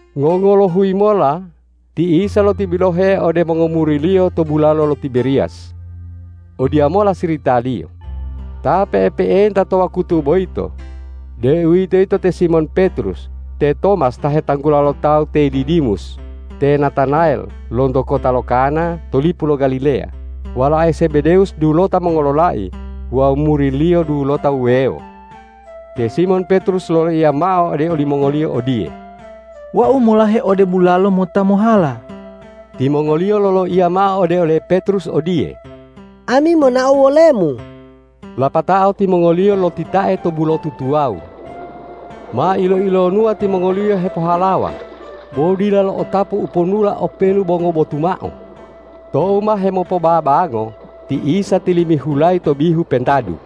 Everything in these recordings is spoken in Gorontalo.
Ngongolohuyi mola ti Isa lotibilohe ode mongomuri-Liyo to bulalo lo Tiberiyas. Odiyamola siritaliyo: Ta pe'epe'enta to wakutu boyito, deuwitoyito te Simon Petrus, te Tomas ta hetanggula lo tawu te Didimus, te Natanayel lonto kota lo Kana to lipu lo Galileya, walae Zebedewus dulota mongololai wawu muri-Liyo dulota wuwewo. Te Simon Petrus loloiya mao ode olimongoliyo odiye,”Wau molahe ode bulalo mota mohala.” Timongoliyo loloiya mao ode ole Petrus odiye,”Ami monao wolemu.” Lapatao timongoliyo lotitae to bulotu tuwawu. Ma ilo-ilonuwa timongoliyo hepohalawa, bo dila lo'otapu uponula openu bo ngobotu mao. Tou ma hemopobabango ti Isa tilimihulayi to bihu pentadu.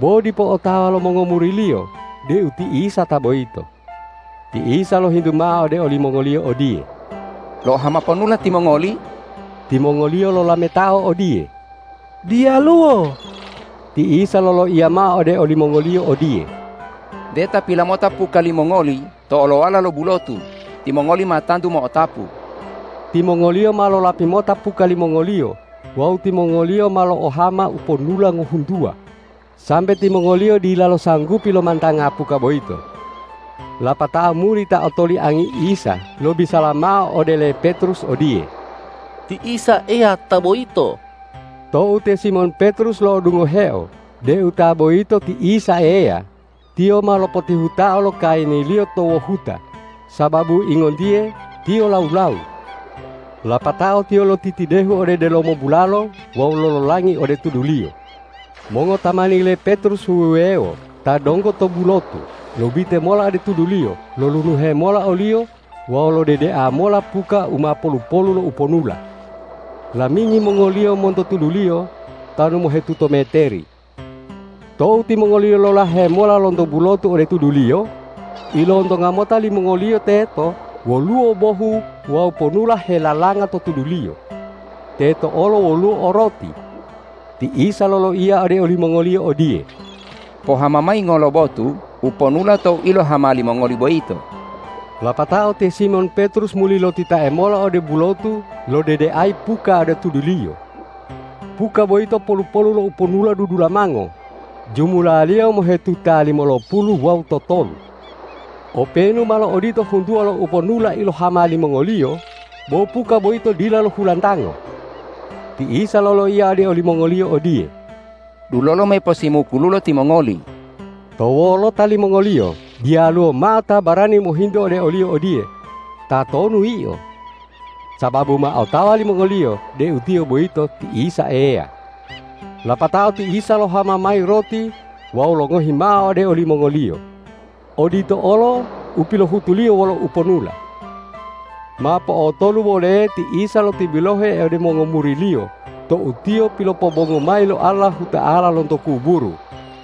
Bo dipo otawa lo mongomuri-Liyo deu ti Isa ta boyito. Ti Isa lohintu mao ode olimongoliyo odiye,”Lo'ohama ponula timongoli?” Timongoliyo lolametao odiye,”Diyaluwo.” Ti Isa loloiya mao ode olimongoliyo odiye,”Nte tapila mota puka limongoli to olowala lo bulotu, timongoli ma tantu mo'otapu.” Timongoliyo ma lolapi mota puka limongoliyo wawu timongoliyo ma lo'ohama uponula ngohuntuwa, sambe timongoliyo dilalo sanggupi lomantanga puka boyito. Lapatao muri ta otoliangi Isa lobisala mao ode le Petrus odiye,”Ti Isa Eya ta boyito!” Tou te Simon Petrus lo'odungoheo deu ta boyito ti Isa Eya, tiyo ma lopotihutao lo kayiniliyo to wohuta sababu ingontiye tiyo lawu-lawu. Lapatao tiyo lotitidehu ode delomo bulalo wawu lololangi ode tuduliyo. Mongotamani le Petrus wuwewo ta donggo to bulotu lobite mola ode tuduliyo lolunuhe mola oliyo wawu lodedea mola puka u ma polu-polu lo uponula. Lamingi mongoliyo monto tuduliyo tanu mohetuto meteri. Tou timongoliyo lolahe mola lonto bulotu ode tuduliyo, ilontonga mota limongoliyo teto woluwo bohu wawu ponula helalanga to tuduliyo. Teto olo woluwo o roti. Ti Isa loloiya ode olimongoliyo odiye,”Pohama mayi ngolobotu uponula to u ilohama limongoli boyito.” Lapatao te Simon Petrus muli lotitae mola ode bulotu lodedeayi puka ode tuduliyo. Puka boyito polu-polu lo uponula dudulamango, jumulaliyo mohetuta limolopulu wawu totolu. Openu malo odito huntuwa lo uponula ilohama limongoliyo, bo puka boyito dila lohulantango. Ti Isa loloiya ode olimongoliyo odiye,”Dulolo, me posimukululo timongoli.” To wolota limongoliyo diyaluwo mao ta barani mohintu ode oliyo odiye,”Tatonu Yio?” Sababu ma otawa limongoliyo deu Tiyo boyito ti Isa Eya. Lapatao ti Isa lohama mayi roti wawu longohi mao ode olimongoliyo. Odito olo u pilohutu-Liyo wolo uponula. Ma po'otolu woleye ti Isa lotibilohe ode mongomuri-Liyo tou Tiyo pilopobongu mayi lo Allahuta'ala lonto kuburu.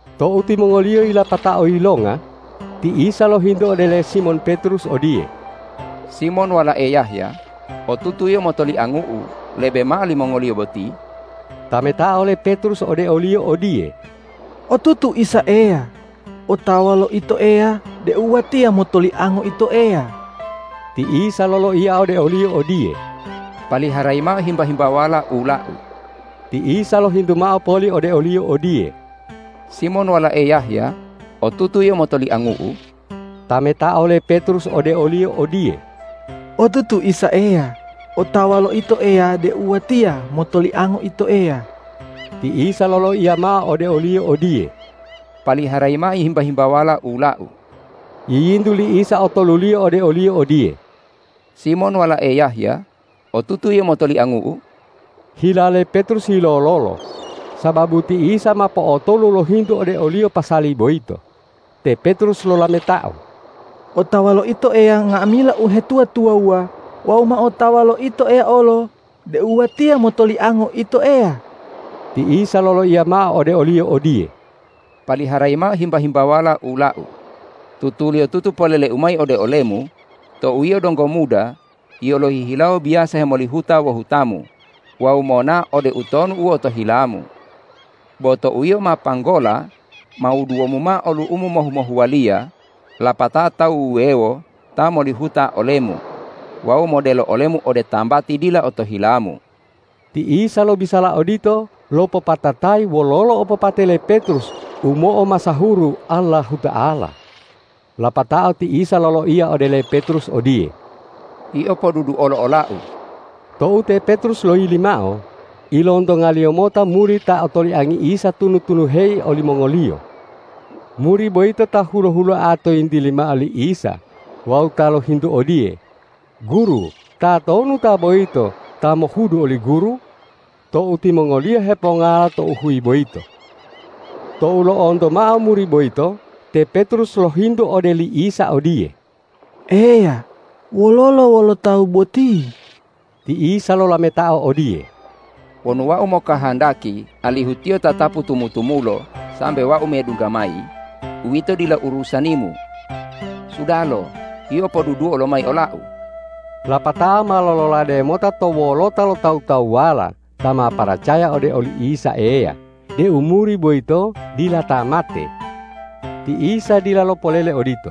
Tou timongoliyo yilapatao yilonga, ti Isa lohintu ode le Simon Petrus odiye,”Simon walae Yahya, otutu yio motoliangu-U lebe mao limongoliyo boti?” Tametao le Petrus ode o-Liyo odiye,”Otutu, Isa Eya otawa lo Ito Eya deu watiya motoliango Ito Eya.” Ti Isa loloiya ode oliyo odiye,”Paliharayi mao himba-himbawala ula-U.” Ti Isa lohintu mao poli ode oliyo odiye,”Simon walae Yahya, otutu yio motoliangu-U?” Tametao le Petrus ode o-Liyo odiye,”Otutu, Isa Eya otawa lo Ito Eya deu watiya motoliango Ito Eya.” Ti Isa loloiya mao ode oliyo odiye,”Paliharayi mao himba-himbawala ula-U.” Yiyintu li Isa otoluliyo ode oliyo odiye,”Simon walae Yahya, otutu yio motoliangu-U?” Hila le Petrus yilololo sababu ti Isa ma po'otolu lohintu ode oliyo pasali boyito. Te Petrus lolametao,”Otawa lo Ito Eya nga'amila uhetuwa-tuwawuwa wawu ma otawa lo Ito Eya olo deu watiya motoliango Ito Eya.” Ti Isa loloiya mao ode oliyo odiye,”Paliharayi mao himba-himbawala ula-U. Tutuliyotutu polele-U mayi ode olemu: Tou yio donggo muda, yio lohihilawo biyasa hemolihuta wohutamu wawu monao ode utonu u otohilamu. Bo tou yio ma panggola, ma wuduwomu mao olu'umu mohu-mohuwaliyo, lapatao tawu wuwewo ta molihuta olemu wawu modelo olemu ode tambati dila otohilamu.” Ti Isa lobisala odito lopopatatayi wololo opopate le Petrus u mo'omasahuru Allahuta'ala. Lapatao ti Isa loloiya ode le Petrus odiye,”Yio poduduolo ola-U!” Tou te Petrus loyili mao, ilontongaliyo mota muri ta otoliangi Isa tunu-tunuheyi olimongoliyo. Muri boyito ta hulo-huloa to yintili mao li Isa wawu ta lohintu odiye,”Guru, tatonu ta boyito ta mohudu oli Guru?” tou timongoliyo hepongala tou huyi boyito. Tou lo'onto mao muri boyito, te Petrus lohintu ode li Isa odiye,”Eya, wololo wolo tawu boti?” Ti Isa lolametao odiye,”Wonu Wau mokahandaki alihu tiyo tatapu tumu-tumulo sambe Wau medungga mayi, uwito dila urusanimu. Sudalo, yio poduduo lomayi ola-U!” Lapatao ma lololade mota to wolota lo tawu-tawuwala ta ma paracaya ode oli Isa Eya deu muri boyito dila ta mate. Ti Isa dila lopolele odito.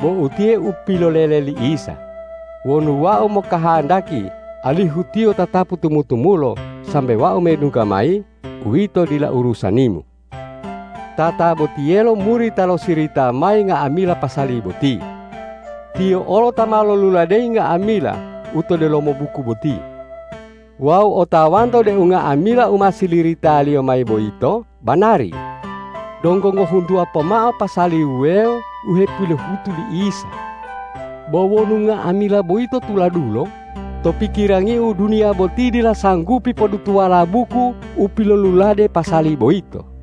Bo utiye u pilolele li Isa,”Wonu Wau mokahandaki alihu tiyo tatapu tumu-tumulo sambe Wau medungga mayi, uwito dila urusanimu.” Tatabotiyelo muri ta lo sirita mayi nga'amila pasali boti. Tiyo olo ta ma loluladeyi nga'amila u to delomo buku boti. Wawu otawanto deu nga'amila u ma siliritaliyo mayi boyito banari. Donggo ngohuntuwa pomao pasali wuwewo u hepilohutu li Isa. Bo wonu nga'amila boyito tuladulo, to pikirangiu duniya boti dila sanggupi podutuwala buku u pilolulade pasali boyito.